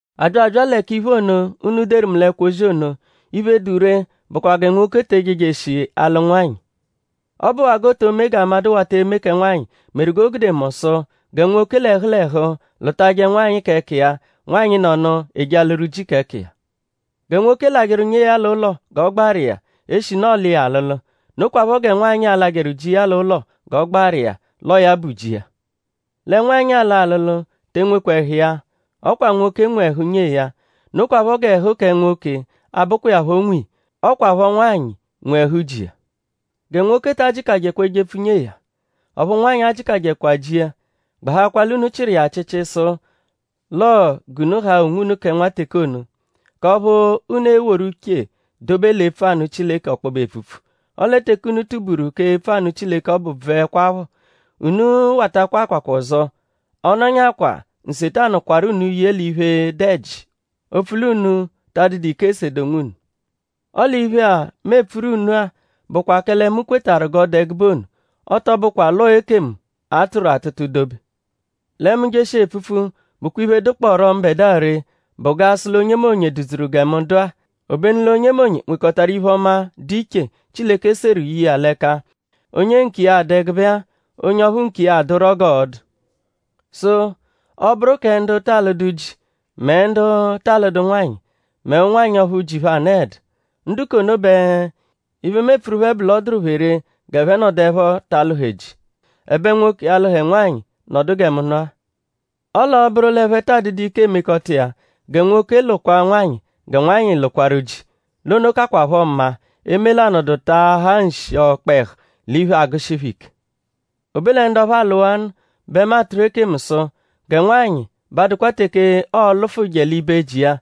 A bya abya lẹ k'iphe ono, unu deru mu l'ẹkwo-ozi ono. Iphe, dụ ree bụkwa gẹ nwoke te ejejeshi alụ nwanyị. Ọ bụwaa g'o to me g'amadụ wata eme kẹ nwanyị meru g'o gude mu sụ: gẹ nwoke l'ẹhu l'ẹhu lụtaje nwanyị k'ẹka iya; nwanyị nọnu eje alụru ji k'ẹka iya. Gẹ nwoke lajẹru nyee ya l'ụlo g'ọ gbaru iya eshinu ọolu iya alụlu. Nokwaphọ gẹ nwanyị a-lajẹru ji iya l'ụlo g'ọ gbaru iya l'ọo ya bụ ji iya. Lẹ nwanyị, aalụ alụlu te enwekwa ẹhu iya. Ọ kwa nwoke nwe ẹhu nyee ya. Nokwaphọ g'ẹhu kẹ nwoke 'abụkwa iya phọ nwe iya. Ọ kwaphọ nwanyị nwe ẹhu ji iya. Gẹ nwoke ta ajịkajekwa ejepfu nyee ya; ọphu nwanyị ajịkajekwa ji iya; gbahakwa l'unu chịru iya achịchi sụ l'ọo g'unu haa onwunu kẹ nwateke ono; k'ọphu unu e-woru uche dobe l'epfu anụ Chileke ọkpobe epfupfu. Ọle teke unu tuburu k'epfu anụ Chileke ọbu bvụekwapho; unu watakwa akwakwa ọzo; ọ -nọnyakwaa Nsetanu kwarụ unu ye l'iphe, dụ ẹji opfu l'unu ta adụdu ike esede onwunu. Ọle iphe-a, mu epfuru unu-a bụkwa kẹle mu kwetarụ g'ọ dụ ẹgube ono; ọ tọ bụkwa l'ọo ekemu, a tụru atụtu dobe. Lẹ mu -jeshia epfupfu; bụkwa iphe, dụkporo mbẹdua ree bụ g'a sụ l'onyemonye dụ-dzuru gẹ mu dụ-a; obenu l'onyemonye nwekọtaru iphe-ọma, dụ iche, Chileke seru ye iya l'ẹka; onye nkiya adụ ẹgube-a; onye ọphu nkiya adụro g'ọo-dụ. Sụ: ọ -bụru kẹ ndu ta alụdu ji mẹ ndu ta alụdu nwanyị; mẹ ụnwanyi ọphu ji phẹ anọedu; ndu k'ono bẹ iphe, mu epfuru phẹ bụ l'ọ dụru phẹ ree g'ẹphe nọduepho ta alụhe ji; ẹbe nwoke alụhe nwanyị; nọdu gẹ mu nọ-a. Ọle ọ -bụru l'ẹphe taa dụdu ike emekọta iya; gẹ nwoke lụkwaa nwanyị; gẹ nwanyị lụkwaru ji. L'ono kakwaphọ mma eme l'anọdu taahaa nshi ọkpehu l'iphe, agụshi phẹ ike. O be lẹ ndu ọphu alụwaanu bẹ mu atụru ekemu sụ; gẹ nwanyị b'adụkwa teke ọo-lụfuje libe ji iya.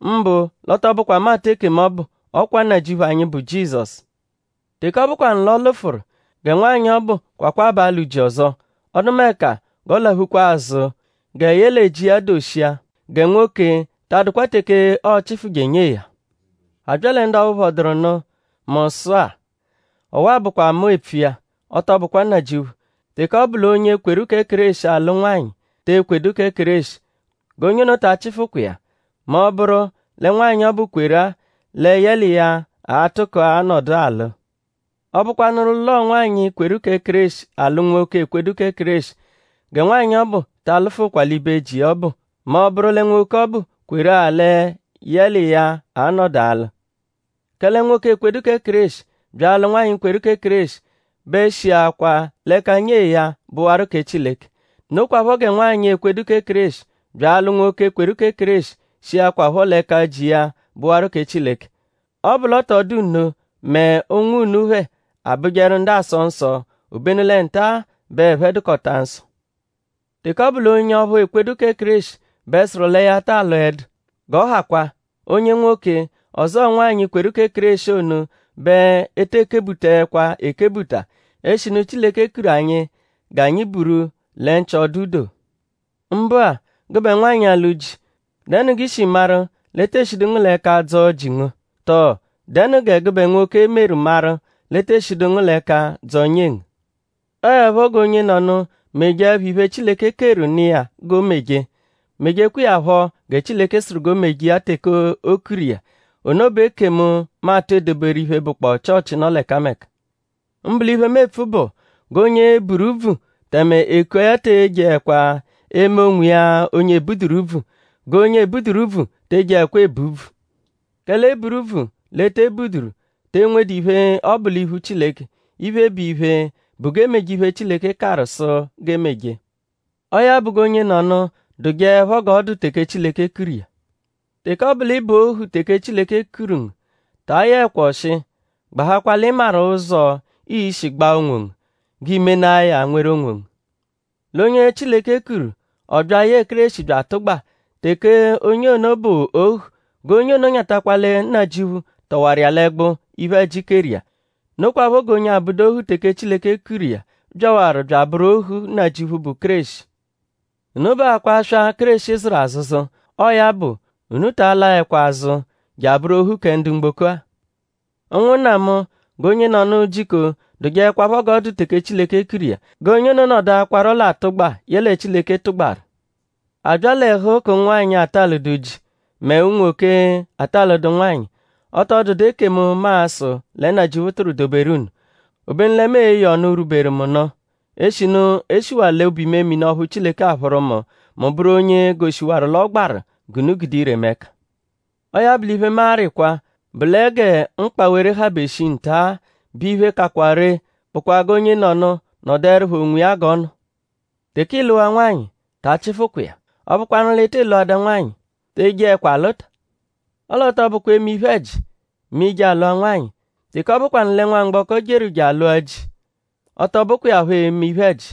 Mbụ l'ọ tọ bụkwa mu atụ ekemu ọbu; ọ kwa Nnajịuphu anyi, bụ Jizọsu. Teke ọ bụkwanu l'ọ lụfuru; gẹ nwanyị ọbu kwakwaa b'alụ ji ọzo; ọdumeka g'ọ laphukwa azụ gẹ yẹle ji iya doshia. Gẹ nwoke ta adụkwa teke ọo-chifuje nyee ya. A bya lẹ ndu ọphu phọduru nụ mu sụ-a; ọwa-a bụkwa mu epfu iya; ọ tọ bụkwa Nnajịuphu; teke ọ bụ l'onye kweru kẹ Kéreshi alụ nwanyị, te ekwedu kẹ Kéreshi; g'onye ono ta achịfukwa iya mẹ ọ -bụru lẹ nwanyị ọbu kweru-a lẹ yẹ l'iya a-tụko-a nọdu alụ. Ọ -bụkwanuru l'ọo nwanyị, kweru kẹ Kéreshi alụ nwoke, ekwedu kẹ Kéreshi; gẹ nwanyị ọbu ta alụfukwa l'ibe ji iya ọbu; mẹ ọ -bụru lẹ nwoke ọbu kweru-a lẹ yẹ l'iya a-nọdu alụ. Kẹle nwoke, ekwedu kẹ Kéreshi bya alụ nwanyị, kweru kẹ Kéreshi bẹ shiakwaa l'ẹka nyee ya bụwaru kẹ Chileke. Nokwaphọ gẹ nwanyị, ekwedu kẹ Kéreshi bya alụ nwoke, kweru kẹ Kéreshi shiakwaphọ l'ẹka ji iya bụwaru kẹ Chileke. Ọ -bụ l'ọ tọ dụ nno mẹ ụnwu unu phẹ abụjeru ndu aasọ nsọ; obenu lẹ nta-a bẹ ẹphe dụkota nsọ. Teke ọ bụ l'onye ọphu ekwedu kẹ Kéreshi bẹ sụru lẹ ya ta alụedu; g'ọ hakwaa. Onye nwoke ọzoo nwanyị kweru kẹ Kéreshi ono bẹ e tee kebutaẹkwa ekebuta; eshinu Chileke kuru anyi g'anyi buru lẹ nchị-ọdu-doo. Mbụ-a; gụbe nwanyị, alụ ji;?dẹnu g'ishiru maru l'e tee shidu ngu l'ẹka dzọo ji ngu? Tọo?dẹnu gẹ gụbe nwoke meru maru l'e tee shidu ngu l'ẹka dzọo nyee ngu? Ọo 'ẹpho g'onyenọnu mejeẹpho iphe, Chileke keru nụ iya g'o meje; mejekwa iya phọ gẹ Chileke sụru g'o meje iya teke o kuru iya. Ono bụ ekemu, mu atụ edoberu iphe, bụkpoo Chịochi, nọ l'ẹkameka. Mbụ l'iphe, mu epfu bụ; g'onye buru úbvù tẹme e kua ya te ejeẹkwa eme onwiya onye e buduru úbvù. G'onye ebuduru úbvù te ejeẹkwa ebu úbvù. Kẹle e buru úbvù l'e te ebuduru te enwedu iphe, ọ bụ l'iphu Chileke. Iphe, bụ iphe bụ g'e meje iphe, Chileke karụ sụ g'e meje. Ọo ya bụ g'onyenọnu dụjeepho g'ọ dụ teke Chileke kuru iya. Teke ọ bụ l'ị bụ ohu teke Chileke kuru ngu; ta ayọekwa ọshi. Gbahakwa l'ị maru ụzo, ii-shi gbaa onwongu; g'i menaa ya nweru onwongu. L'onye Chileke kuru; ọ bya yẹe Kéreshi bya atụgba; teke onye ono bụ ohu; g'onye ono nyatakwa lẹ Nnajịuphu tọwaru iya l'ẹgbu, iphe-ẹji keru iya. Nokwaphọ g'onye 'abụdu ohu teke Chileke kuru iya byawaru bya abụru ohu Nnajịuphu, bụ Kéreshi. Unu bụakwaa aswa, Kéreshi zụru azụzu. Ọo ya bụ; unu ta laẹkwa azụ je abụru ohu kẹ ndu mgboko-a. Ụnwunna mu; g'onyenọnu jiko dụjeekwapho g'ọ dụ teke Chileke kuru iya; g'onye ono nọduakwaro l'atụgba, yẹle Chileke tụgbaru. A bya l'ẹhu k'ụnwanyi, ata alụdu ji mẹ unwoke, ata alụdu nwanyị; ọ tọ dụdu ekemu, mu a-sụ lẹ Nnajịuphu tụru doberu unu. Obenu lẹ mu e-ye ọnu, rwuberu mu nụ; eshinu e shiwaa l'obu-imemini ọphu Chileke aphụru mu; mu bụru onye goshiwaru l'ọ gbaru g'unu gude ire mu ẹka. Ọo ya bụ l'iphe, mu arịkwa bụ lẹ gẹ mkpawere habe shii nta-a bẹ iphe, kakwa ree bụkwa g'onyenọnu nọduerupho onwiya g'ọ nọ. Teke ịiluwaa nwanyị; ta achịfukwa iya. Ọ bụkwanuru l'ị tị lụada nwanyị; te jeẹkwa alụta. Ọle ọ tọ bụkwa eme iphe-ẹji mẹ i -je alụa nwanyị. Teke ọ bụkwanu lẹ nwamgbọko jeru je alụa ji; ọ tọ bụkwa iya phọ eme iphe-ẹji.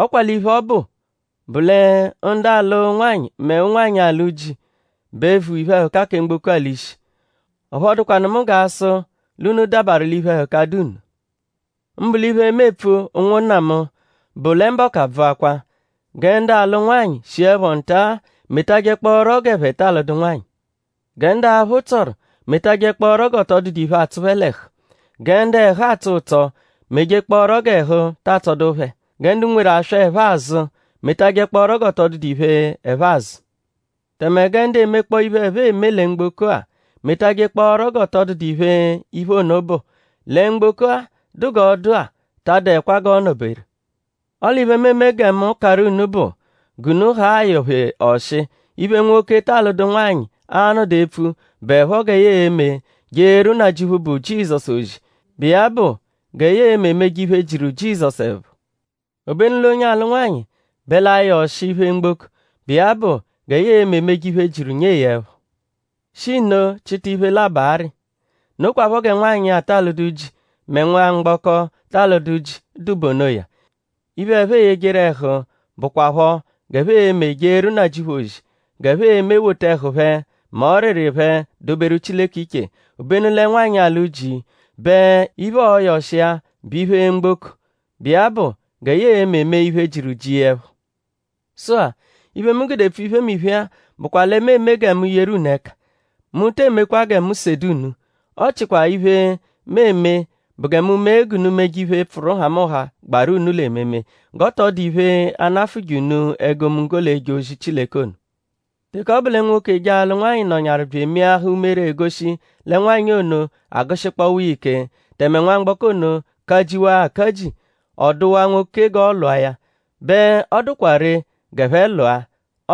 Ọ kwa l'iphe, ọ bụ bụ lẹ ndu alụ nwanyị mẹ ụnwanyi, alụ ji bẹ vu iphe-ẹhuka kẹ mgboko-a l'ishi. Ọphu ọ dụkwanu mu g'a sụ l'unu dabarụ l'iphe-ẹhuka, dụ nno. Mbụ l'iphe, mu epfu ụnwunna mu; bụ lẹ mbọku abvụakwa. Gẹ ndu alụ nwanyị shiẹpho nta-a metajẹkpooro g'ẹphe ta alụdu nwanyị. Gẹ ndu aphụ tsọru metajẹkpooro g'ọ tọ dụdu iphe, atsụ phẹ l'ẹhu. Gẹ ndu ẹhu atsọ ụtso mejekpọoro g'ẹhu ta atsọdu phẹ. Gẹ ndu nweru aswa, ẹphe azụ metajẹkpooro g'ọ tọ dụdu iphe, ẹphe azụ. Tẹme gẹ ndu emekpọo iphe, ẹphe eme lẹ mgboko-a metajẹkpooro g'ọ tọ dụdu iphe, iphe ono bụ. Lẹ mgboko-a, dụ g'ọ dụ-a ta adụekwa g'ọo-nọ-beru. Ọle iphe, mu eme gẹ mu karụ unu bụ g'unu haa ayọ-phe ọshi. Iphe nwoke, ta alụdu nwanyị a-nọdu epfu bụepho gẹ ya e-me jeeru Nnajịuphu, bụ Jizọsu ozi, bụ iya bụ gẹ ya e-me meje iphe, jiru Jizọsu ẹpho. Obenu l'onye alụ nwanyị bẹ l'ayọ ọshi iphe mgboko, bụ iya bụ gẹ ya e-me meje iphe, jiru nyee ya ẹpho; shi nno chịta iphe labọ arị. Nokwaphọ gẹ nwanyị, ata alụdu ji mẹ nwamgbọko, ta alụdu ji dụ bụ onoya; iphe, ẹphe eyejeru ẹhu bụkwapho g'ẹphe e-me jeeru Nnajịuphu ozi; g'ẹphe e-me wota ẹhu phẹ mẹ ọriri phẹ doberu Chileke iche. Obenu lẹ nwanyị, alụ ji bẹ iphe, ọoyo ọshi iya bụ ọshi iphe mgboko, bụ iya bụ gẹ ya e-me mee iphe, jiru ji iya ẹpho. Sụ-a; iphe, mu gude epfu iphemiphe-a bụkwa lẹ mu eme gẹ mu yeru unu ẹka. Mu te emekwa gẹ mu sede unu. Ọ chikwaa iphe, mu eme bụ gẹ mu mee g'unu meje iphe, pfụru nhamụnha, gbaru unu l'ememe; g'ọ tọ dụ iphe, a-nafụje unu egomunggo l'eje ozi Chileke ono. Teke ọ bụ lẹ nwoke, eje alụ nwanyị nọnyaru bya emeahaa umere egoshi lẹ nwanyị ono agụshikpowa iya ike; tẹme nwamgbọko ono kajiwaa akaji; ọ dụwaa nwoke g'ọ lụa ya; bẹ ọ dụkwa ree g'ẹphe lụa.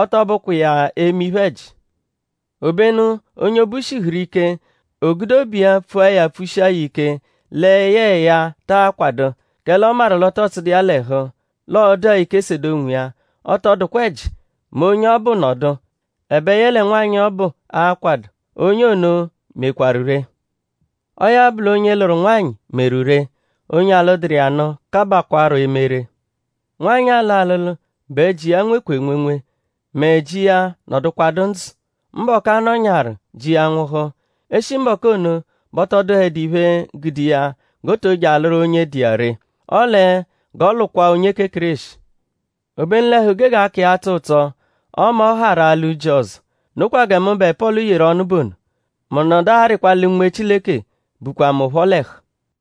Ọ tọ bụkwa iya eme iphe-ẹji. Obenu onye obu shihuru ike; o gude obu iya pfua ya pfushia ya ike lẹ yẹe ya taa kwadụ; kẹle ọ maru l'ọ tọ tsụdu iya l'ẹhu; l'ọo-dụa ike sede onwiya; ọ tọ dụkwa ẹji mẹ onye ọbu nọdu; ẹbe yẹle nwanyị ọbu akwadụ. Onye ono mekwarụ ree. Ọo ya bụ l'onye lụru nwanyị meru ree. Onye alụduru iya nụ kabakwarọ eme ree. Nwanyị, aalụ alụlu bẹ ji iya nwekwa enwenwe mẹ ji iya -nọdukwadu ndzụ. Mbọku, ọ nọnyawaru ji iya nwụhu; e -shi mbọku ono bẹ ọ tọ dụhedu iphe, gude iya g'o to je alụru onye dụ iya ree. Ọle g'ọ lụkwaa onye kẹ Kéreshi. Obenu l'ẹhu gege aka iya atsọ ụtso ọme ọ harụ alụ ji ọzo. Nokwa gẹ mụbe Pọlu yeru ọnu bụ ono. Mu nọdu arịkwa lẹ Unme Chileke bukwa mu phọ l'ẹhu.